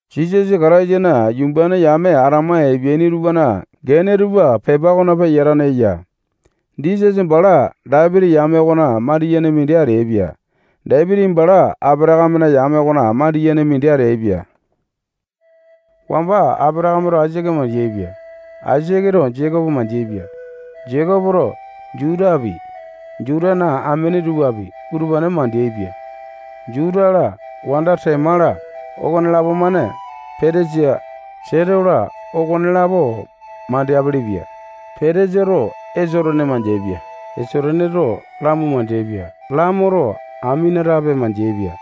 Jisasa Kataisana yumbane yame atama epeaini tupana gene tupa pepa okona peyatane eya. Jisasa bala Dapiti yame okona mandiyene mindi ateaipia. Dapiti bala Apatakame yame okona mandiyene mindi ateaipia. Wamba Apatakameto Aisake mandeaipia. Aisaketo Jekopo mandeaipia. Jekopoto Jutapi, Jutana amene tupapi, utupane mandeaipia. Juta-la, wanda Tema-la, okonelapo-mane Petesa, Seto-la, okonelapo mandeapele-pia. Petesato Esotone mandeaipia. Esotoneto Lamo mandeaipia. Lamoto Aminatape mandeaipia.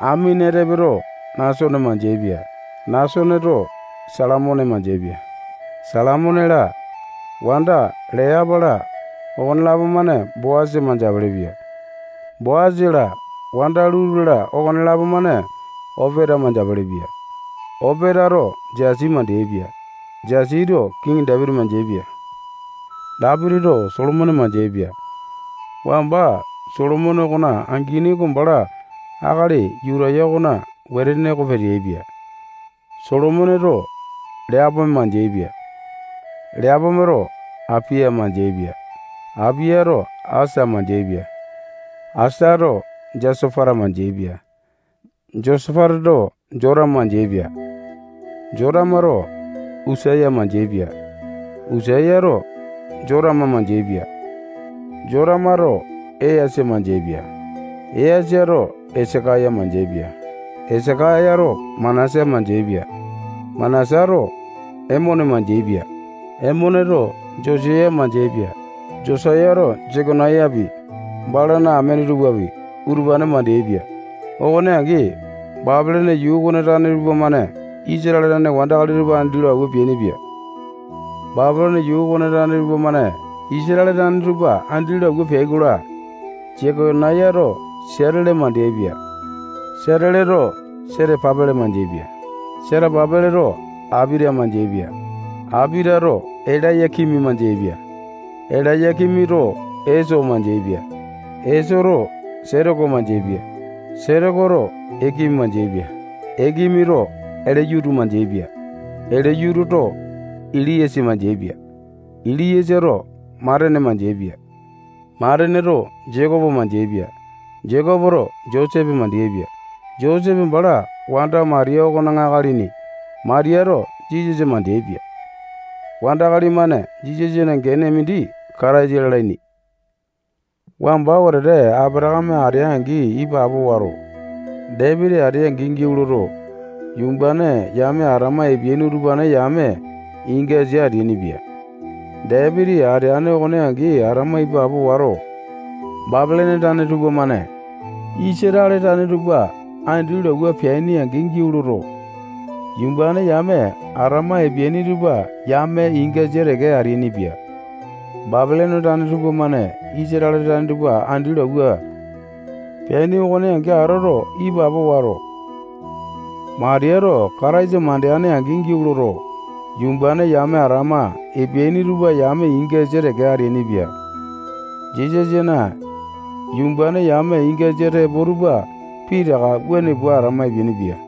Aminatapeto Nasone mandeaipia. Nasoneto Salamone mandeaipia. Salamone-la, wanda Leapa-la, okonelapo-mane Boasa mandeapele-pia. Boasa-la, wanda Luta-la, okonelapo-mane Opeta mandeapele-pia. Opetato Jesi mandeaipia. Jesito kiŋi Dapiti mandeaipia. Dapitito Solomone mandeaipia. Wamba Solomone okona angini oko bala akali Yutaya okona wetene oko peteaipia. Solomoneto Leapome mandeaipia. Leapometo Apiya mandeaipia. Apiyato Asa mandeaipia. Asato Josapata mandeaipia. Josapatato Jotama mandeaipia. Jotamato Usaya mandeaipia. Usayato Jotama mandeaipia. Jotamato Easa mandeaipia. Easato Esakaya mandeaipia. Esakayato Manasa mandeaipia. Manasato Emone mandeaipia. Emoneto Josaya mandeaipia. Josayato Jekonayapi, balana amene tupapi, utupane mandeaipia. Okone angi, Bapilone yuu okona tane tupamane Isatale tane wandakali tupa andi lo awua peainipia. Bapilone yuu okona tane tupamane Isatale tane tupa andi lo awua peai-kola, Jekonayato Siatele mandeaipia. Siateleto Setapa-pele mandeaipia. Setapa-peleto Apiata mandeaipia. Apiatato Elaya-kimi mandeaipia. Elaya-kimito Eso mandeaipia. Esoto Setoko mandeaipia. Setokoto Ekimi mandeaipia. Ekimito Eliyutu mandeaipia. Eliyututo Eliasa mandeaipia. Eliasato Matane mandeaipia. Mataneto Jekopo mandeaipia. Jekopoto Josepe mandeaipia. Josepe bala wanda Matiya okona akalini. Matiyato Jisasa mandeaipia. Wandakali-mane Jisasana gene mindi Kataisa lalaini. Wamba wetete Apatakame atea-angi ipapo wato, Dapiti atea-angi giau loto, yumbane yame atama epeaini utupane yame ingasa ateainipia. Dapiti ateane okone angi atama ipapo wato, Bapilone tane tupamane Isatale tane tupa andi lo awua peaini-angi giau loto, yumbane yame atama epeaini tupa yame ingasa teke ateainipia. Bapilone tane tupamane Isatale tane tupa andi lo awua peaini okone angi atoto, ipapo wato, Matiyato Kataisa mandeane-angi giau loto, yumbane yame atama epeaini tupa yame ingasa teke ateainipia. Jisasana yumbane yame ingasa tepo tupa pitaka wuane pua atama epeainipia.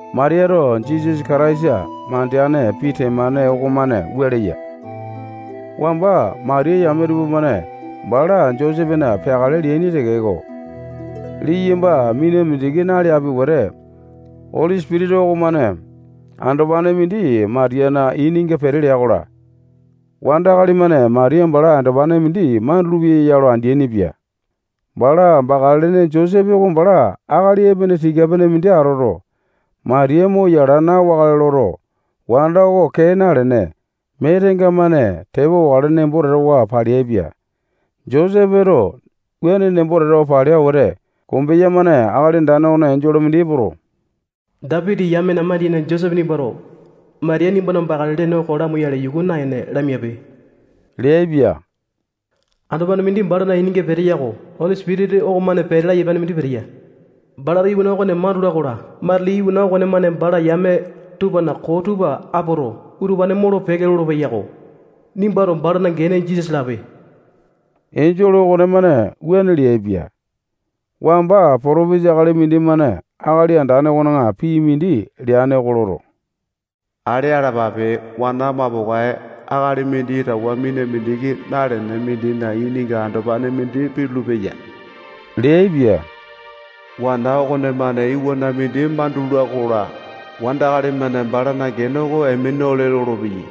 Matiyato Jisasa Kataisa mandeane pii temane okomane wua leya: Wamba Matiya yame tupamane bala Josepena peakale leaini tekeko, liyamba mina mindiki naleapi wete, Oli Sipitisa okomane andopane mindi Matiyana ininga pete lea-kola, wandakali-mane Matiya bala andopane mindi mandulu-peya ya lo andeaini-pia. Bala bakale lene Josepe oko bala akali epene tika-pene mindi atoto, Matiya mo yala aya na-wakale loto, wanda oko kee nalene, mee tenga-mane tepa wakale nembo tatawa paleaipia. Josepeto wuane nembo tatawa palea wete, kombeya-mane Akali Andane okona enjole mindi epoto, Dapiti yamena mandiyene Josepe nimbato Matiya nimbana bakale lene oko lamoyale yuku naene, lamiape leaipia. Andopane mindi balana ininga peteya oko Oli Sipitisa okomane pete laya apiane mindi peteya. Balato iwana okone mandula-kola, matili iwana okonemane bala yame tupana koo tupa apoto, utupane molo-peke lolopeya-ko. Nimbato balana gene Jisasa lape. Enjole okonemane wuane leaipia. Wamba potopesa akali mindimane Akali Andane okona pii mindi leane oko loto, ale alapape, wana mapokae akali mindi towa mina mindiki nalene mindina ininga andopane mindi pitulu-peya leaipia. Wana okonemane iwana mindi mandula-kola, wandakali-mane balana gene oko Emanuale lolopeyai.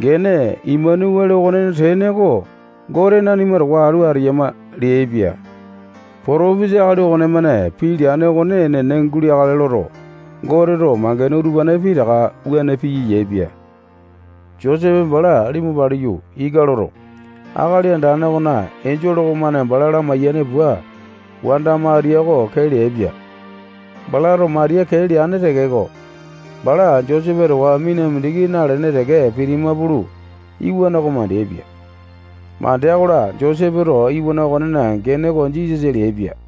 Gene Emanuale okonena tene oko Gote nanima towa atu ateyama leaipia. Potopesa akali okonemane pii leane okone enene guleakale loto, Goteto mangene utupane pitaka wuane piya yaepia. Josepe bala limu paliyu, ika loto, Akali Andane okona enjole okonemane bala lamaiyane pua, wanda Matiya oko kee leaipia. Balato bala kee leane tekeko, Matiya bala Josepe towa mina mindiki nalene teke pitima pulu, iwana oko mandeaipia. Mandea-kola, Josepeto iwana okonena gene oko Jisasa leaipia.